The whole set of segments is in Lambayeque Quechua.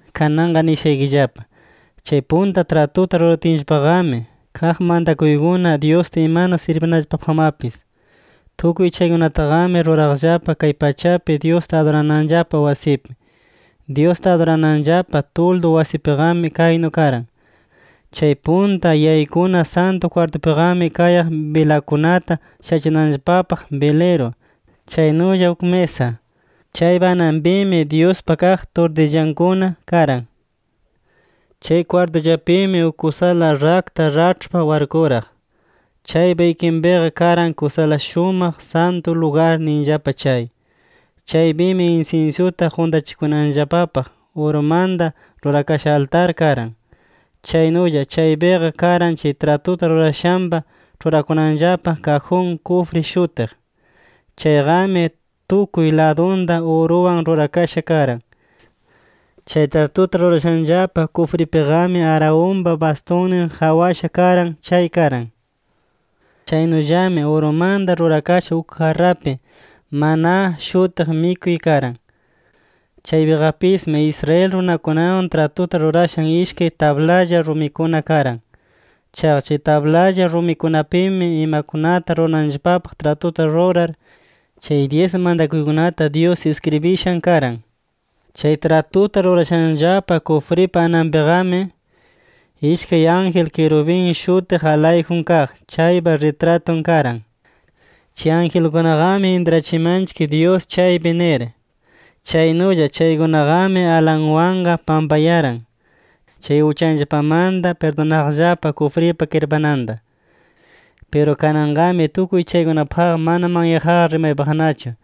Kananqa nishaykillapa: Chay punta tratuta ruratinllapaqami, kaq mantakuykuna Dyusta imanu sirbinanllapapaqmapis. Tukuy chaykunataqami ruraqllapa kay pachapi, Dyusta adurananllapa wasipi. Dyusta adurananllapa tuldu wasipiqami kaynu karan: Chay punta yaykuna Santu kwartupiqami kayaq bilakunata shachinanllapapaq biliru, chaynulla uk misa. Chaypa ananpimi Dyuspa kaq turtillankuna karan. Chay kwartullapimi uk kusala rakta raĉhpa warkuraq. Chaypa ikinpiqa karan Kusala Santu Lugar ninllapa chay. Chaypimi insinsyuta quntachikunanllapapaq urumanta rurakasha altar karan. Chaynulla chaypiqa karan chay tratuta rurashanllapa, ĉhurakunanllapa kajun kufri shutiq. Chayqami tukuy ladunta uruwan rurakasha karan. Chay tratuta rurashanllapa kufripiqami Aaronpa bastunnin qawasha karan chay karan. Chaynullami urumanta rurakasha uk jarrapi “maná” shutiq mikuy karan. Chaypiqapismi Israel runakunawan tratuta rurashan ishkay tablalla rumikuna karan. Chaqa chay tablalla rumikunapimi, imakunata rurananllapapaq tratuta rurar, chay dyis mantakuykunata Dyus iskribishan karan. Chay tratuta rurashanllapa kufripa ananpiqami, ishkay ángel kirubin shutiq alayjun kaq chaypa ritratun karan. Chay angelkunaqami intrachimanchik Dyus chaypi nir. Chaynulla chaykunaqami alanwanqa pampayaran, chay uchanllapamanta pirdunaqllapa kufripa kirpananta. Piru kananqami tukuy chaykunapaqqa mana manyaqqa rimaypaqnachu.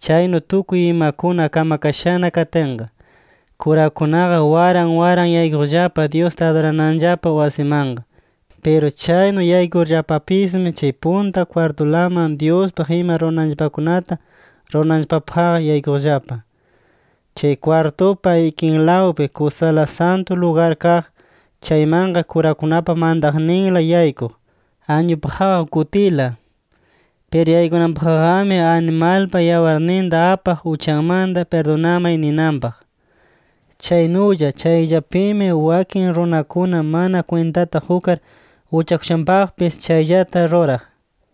Chaynu tukuy imakuna kamakashana katinqa, kurakunaqa waran waran yaykuqllapa Dyusta adurananllapa wasimanqa. Piru chaynu yaykurllapapismi chay punta kwartulaman Dyuspaq ima rurananllapakunata rurananllapapaqqa yaykuqllapa. Chay kwartupa ikinlawnpi Kusala Santu Lugar kaq, chaymanqa kurakunapa mantaqninla yaykuq, añupaqqa uk kutila. Piru yaykunanpaqqami, animalpa yawarninta apaq uchaymanta pirdunamay ninanpaq. Chaynulla chayllapimi wakin runakuna mana kwintata qukar uchakushanpaqpis chayllata ruraq.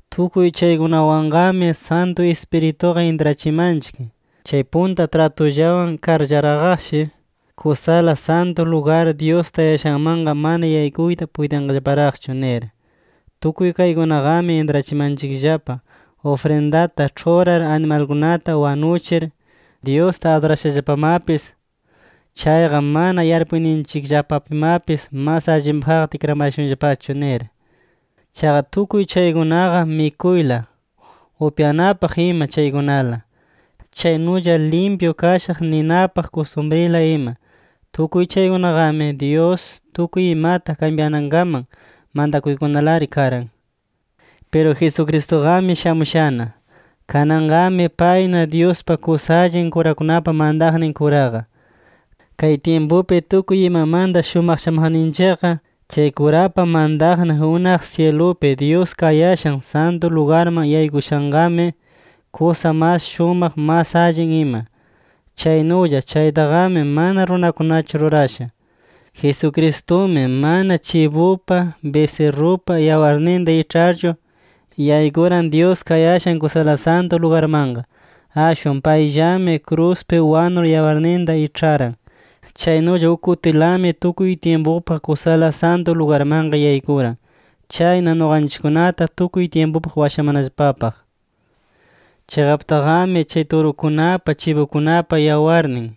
Tukuy chaykunawanqami Santu Ispirituqa intrachimanchik, chay punta tratullawan karllaraqqashi, Kusala Santu Lugar Dyus tayashanmanqa mana tukuyqa yaykuyta puytinqallaparaqchu nir. Tukuy kaykunaqami intrachimanchikllapa, ufrindata ĉhurar animalkunata wanuchir, Dyusta adurashallapamapis chayqa mana yarpuyninchikllapapimapis mas allinpaqqa tikramayashunllapachu nir. Chaqa tukuy chaykunaqa mikuyla, upyananpaq ima chaykunala. Chaynulla limpyu kashaq ninapaq kustumrila ima. Tukuy chaykunaqami, Dyus tukuy imata kambyanankaman mantakuykunalari karan. Piru Jesucristuqami shamushana. Kananqami payna Dyuspa kusa allin kurakunapa mantaqnin kuraqa, kay tyimpupi tukuy imamanta shumaqchamaqninchikqa. Chay kurapa mantaqnin unaq syilupi Dyus kayashan Santu lugarman yaykushanqami, kusa mas shumaq mas allin ima. Chaynulla chaytaqami mana runakunachu rurasha. Jesucristumi mana chibupa, bisirrupa yawarninta iĉharchu, yaykuran Dyus kayashan Kusala Santu Lugarmanqa. Ashwan payllami kruspi wanur yawarninta iĉharan. Chaynulla uk kutilami tukuy tyimpupaq Kusala Santu Lugarmanqa yaykuran. Chayna nuqanchikkunata tukuy tyimpupaq washamanallapapaq. Chiqaptaqami chay turukunapa, chibukunapa yawarnin,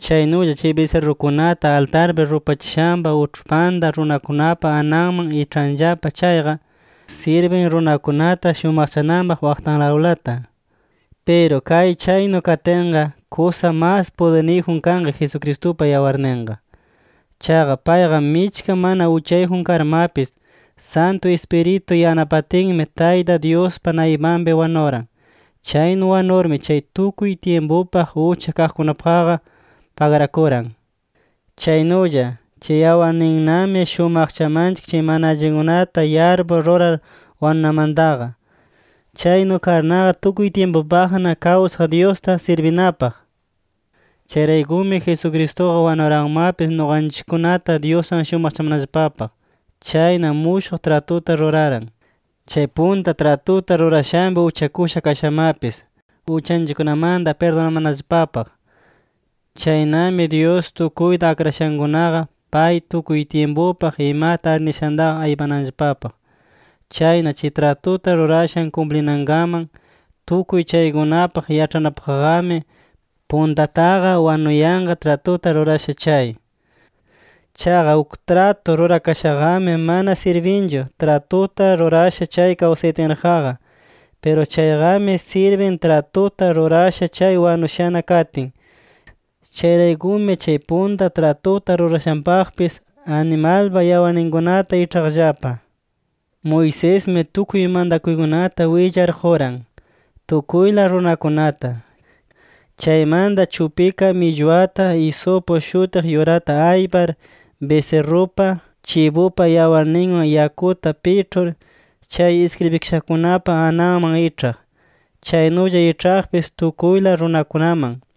chaynulla chay bisirrukunata altarpi rupachishanpa uĉhpanta runakunapa ananman iĉhanllapa chayqa, sirbin runakunata shumaqchananpaq waqtanlawlata. Piru kay chaynu katinqa, ¡kusa mas pudirniyjun kanqa Jesucristupa yawarninqa! Chaqa payqa michka mana uchayjun karmapis, Santu Ispiritu yanapatinmi Tayta Dyuspa naypanpi wanuran. Chaynu wanurmi, chay tukuy tyimpupaq ucha kaqkunapaqqa pagrakuran. Chaynulla, chay yawarninnami shumaqchamanchik chay mana allinkunata yarpur rurar wanunamantaqa. Chaynu karnaqa, tukuy tyimpupaqna kawsaq Dyusta sirbinapaq. Chayraykumi Jesucristuqa wanuranmapis, nuqanchikkunata Dyuswan pullachamanallapapaq. Chayna mushuq tratuta ruraran, chay punta tratuta rurashanpi uchakusha kashamapis, uchanchikkunamanta pirdunamanallapapaq. Chaynami Dyus tukuyta akrashankunaqa, pay tukuy tyimpupaq imata arnishantaqa aypananllapapaq. Chayna chay tratuta rurashan kumplikananpaq, tukuy chaykunapaq yaĉhanapaqqami, puntataqa wanuyanqa tratuta rurasha chay. Chaqa uk tratu rurakashaqami mana sirbinchu, tratuta rurasha chay kawsayatinraqqa. Piru chayqami sirbin tratuta rurasha chay wanushana katin. Chayraykumi chay punta tratuta rurashanpaqpis, animalpa yawarninkunata iĉhaqllapa. Moisesmi tukuy mantakuykunata willar quran, tukuyla runakunata. Chaymanta chupika millwata, isupu shutiq yurata aypar, bisirrupa, chibupa yawarninwan yakuta piĉhur, chay iskribikashakunapa ananman iĉhaq. Chaynulla iĉhaqpis tukuyla runakunaman.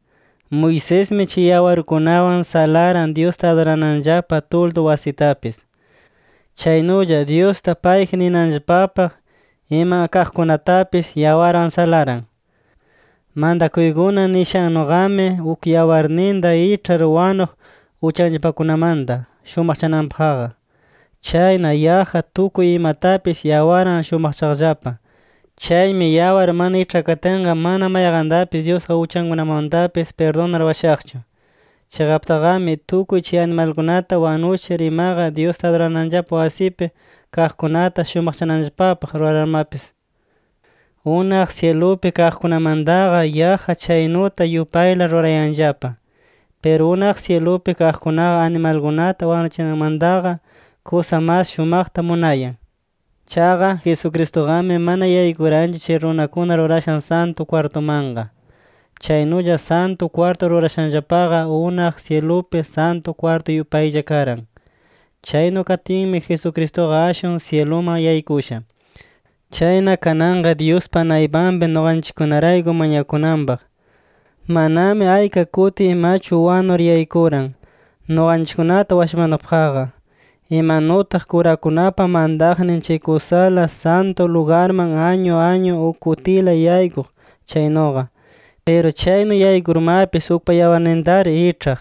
Moisesmi chay yawarkunawan salaran Dyusta adurananllapa tuldu wasitapis. Chaynulla Dyusta payji ninanllapapaq ima kaqkunatapis yawarwan salaran. Mantakuykuna nishannuqami, uk yawarninta iĉhar wanuq uchanllapakunamanta shumaqchakananpaqqa. Chayna yaqqa tukuy imatapis yawarwan shumaqchaqllapa. Chaymi yawar mana iĉhakatinqa, mana mayqantapis Dyusqa uchankunamanmatapis pirdunar washaqchu. Chiqaptaqami tukuy chay animalkunata wanuchir imaqa, Dyusta adurananllapa wasipi kaqkunata shumaqchananllapapaq rurarmapis, unaq syilupi kaqkunamantaqa, yaqqa chaynuta yupayla rurayanllapa. Piru unaq syilupi kaqkunaqa, animalkunata wanuchinamantaqa kusa mas shumaqta munayan. Chaqa Jesucristuqami mana yaykuranchu chay runakuna rurashan Santu kwartumanqa. Chaynulla Santu kwartu rurashanllapaqa, unaq syilupi Santu kwartu yupaylla karan. Chaynu katinmi Jesucristuqa ashwan syiluman yaykusha. Chayna kananqa Dyuspa naypanpi nuqanchikkunarayku mañakunanpaq. Manami ayka kuti imachu wanur yaykuran nuqanchikkunata washamanapaqqa, imanutaq kurakunapa mantaqnin chay Kusala Santu Lugarman añu añu uk kutila yaykuq chaynuqa. Piru chaynu yaykurmapis ukpa yawarnintari iĉhaq.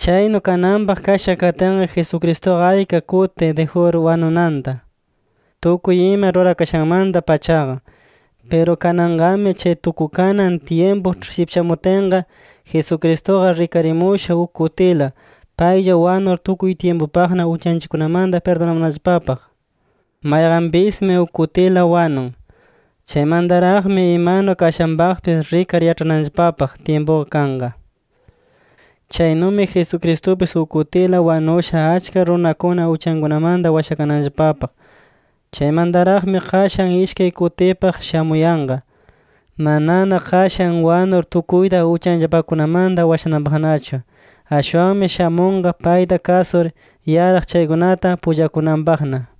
Chaynu kananpaq kasha katinqa, Jesucristuqa ayka kuti dijur wanunanta, tukuy ima rurakashanmanta-pachaqa. Piru kananqami chay tukukanan tyimpu shipchamutinqa, Jesucristuqa rikarimusha uk kutila paylla wanur tukuy tyimpupaqna uchanchikkunamanta pirdunamanallapapaq. Mayqanpismi uk kutila wanun. Chaymantaraqmi imanu kashanpaqpis rikar yaĉhananllapapaq tyimpuqa kanqa. Chaynumi Jesucristupis uk kutila wanusha achka runakuna uchankunamanta washakananllapapaq. Chaymantaraqmi qashan ishkay kutipaq shamuyanqa, manana qashan wanur tukuyta uchanllapakunamanta washananpaqnachu. Ashwanmi shamunqa payta kasur yaraq chaykunata pullakunanpaqna.